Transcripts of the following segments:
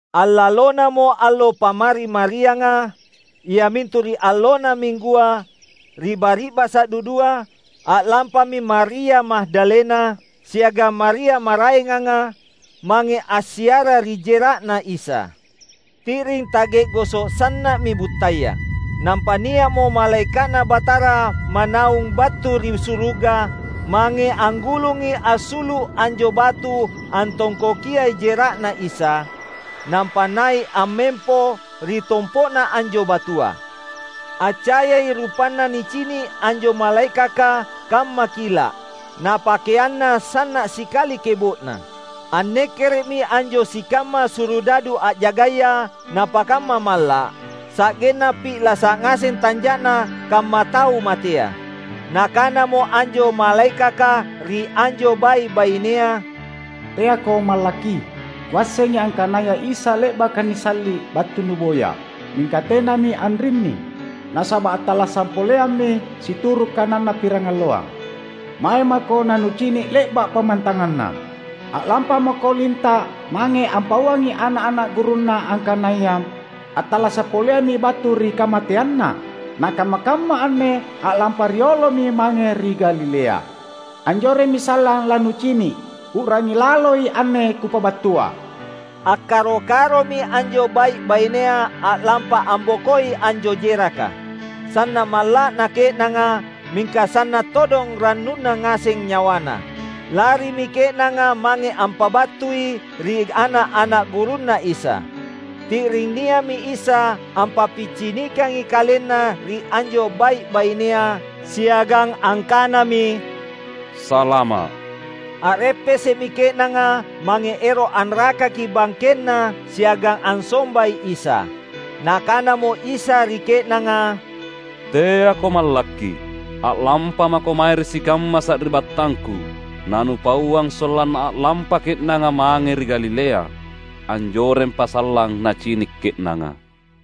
Allalonamo allo Pammari-marianga, iamintu ri allonna Minggua, ri bari’basa’ dudua, a’lampami Maria Magdalena siagang Maria maraenganga, mange assiara ri jera’Na Isa. Ti’ring ta’ge’goso’ sanna’mi buttaya. Nampa nia’mo malaeka’Na Batara manaung battu ri suruga mange anggulungi assulu’ anjo batu antongkokiai jera’Na Isa, nampa nai’ ammempo ri tompo’na anjo batua. Accayai rupanna nicini’ anjo malaekaka kamma kila’, na pakeanna sanna’ sikali kebo’na. Annekkere’mi anjo sikamma surudadu a’jagaya napakamma malla’, sa’genna pi’lasa’ ngaseng tanja’na kamma tau matea. Nakanamo anjo malaekaka ri anjo bai’-bainea, "Teako mallakki! Kuassengi angkanaya Isa, le’baka nisalli’, battu nuboya. Mingka tenami anrinni. Nasaba’ attallasa’ poleammi situru’ kananNa pirangalloang. Mae mako na nucini’ le’ba’ pammantanganNa. A’lampamako linta’ mange ampauangi ana’-ana’ gurunNa angkanaya, ‘Atallasa’ poleammi battu ri kamateanNa, na kamma-kamma anne a’lampa riolomi mange ri Galilea. Anjoremmi sallang lanucini’!’ U’rangi laloi anne kupabattua." Akkaro-karomi anjo bai’-bainea a’lampa ambokoi anjo jeraka. Sanna’ malla’na ke’nanga, mingka sanna’ todong rannuna ngaseng nyawana. Larimi ke’nanga mange ampabattui ri ana’-ana’ gurunNa Isa. Ti’ring nia’mi Isa ampappicinikangi KalenNa ri anjo bai’-bainea, siagang angkanami, "Salama’!" A’reppese’mi ke’nanga mange ero’ anrakaki bangkenNa siagang ansombai Isa. Nakanamo Isa ri ke’nanga, "Teako mallakki, a’lampamako mae ri sikamma sari’battangKu na nupauang sollanna a’lampa ke’nanga mange ri Galilea; anjorempA’ sallang nacini’ ke’nanga."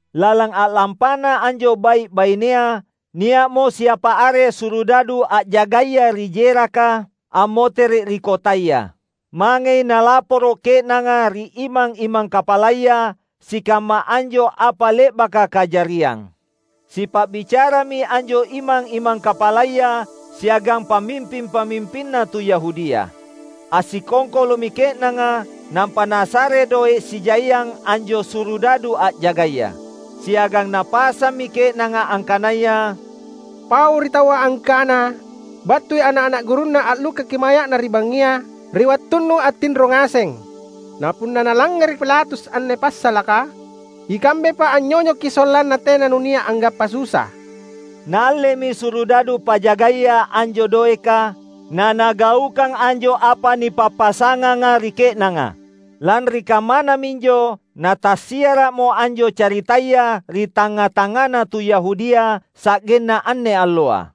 Lalang a’lampana anjo bai’-bainea, nia’mo siapa are Surudadu a’jagaya ri jeraka, ammotere’ ri kotaya. Mangei nalaporo’ ke’nanga ri imang-imang kapalaya sikamma anjo apa le’baka kajariang. Sipa’bicarami anjo imang-imang kapalaya siagang pamimping-pamimpinna tu Yahudia. Assikongkolo’mi ke’nanga, nampa nasare doe’ sijaiang anjo Surudadu a’jagaya. Siagang napasammi ke’nanga angkanaya, "Paui ri taua angkana battui ana’-ana’ gurunNa allukkaki maya’Na ri bangngia ri wattunnu attinro ngaseng. Na punna nalangngere’ Pilatus anne passalaka, ikambepa anynyonyoki sollanna tena nunia’ anggappa susa." Naallemi Surudadu pajagaya anjo doeka, na nagaukang anjo apa nipappasanganga ri ke’nanga. Lanri kammana minjo natassiara’mo anjo caritaya ri tangnga-tangngana tu Yahudia sa’genna anne alloa.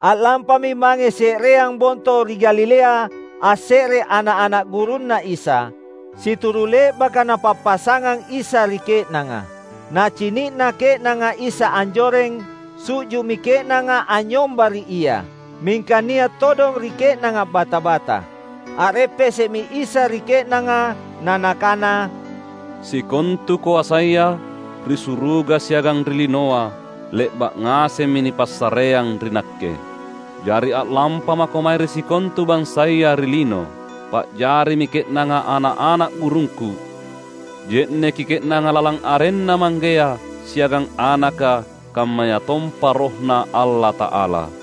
A’lampami mange se’reang bonto ri Galilea asse’re ana’-ana’ gurunNa Isa, situru’ le’baka Napappasangang Isa ri ke’nanga. Nacini’na ke’nanga Isa anjoreng, su’ju’mi ke’nanga anynyomba ri Ia. Mingka nia’ todong ri ke’nanga bata-bata. A’reppese’mi Isa ri ke’nanga, na Nakana, "Sikontu koasaya, ri suruga siagang ri linoa le’ba’ ngasemmi nipassareang ri Nakke. Jari a’lampamako mange ri sikontu bansaya ri lino, pa’jarimi ke’nanga ana’-ana’ gurungKu. Je’neki ke’nanga lalang arenNa Manggea, siagang Anaka, kammayatompa RohNa Allata’ala.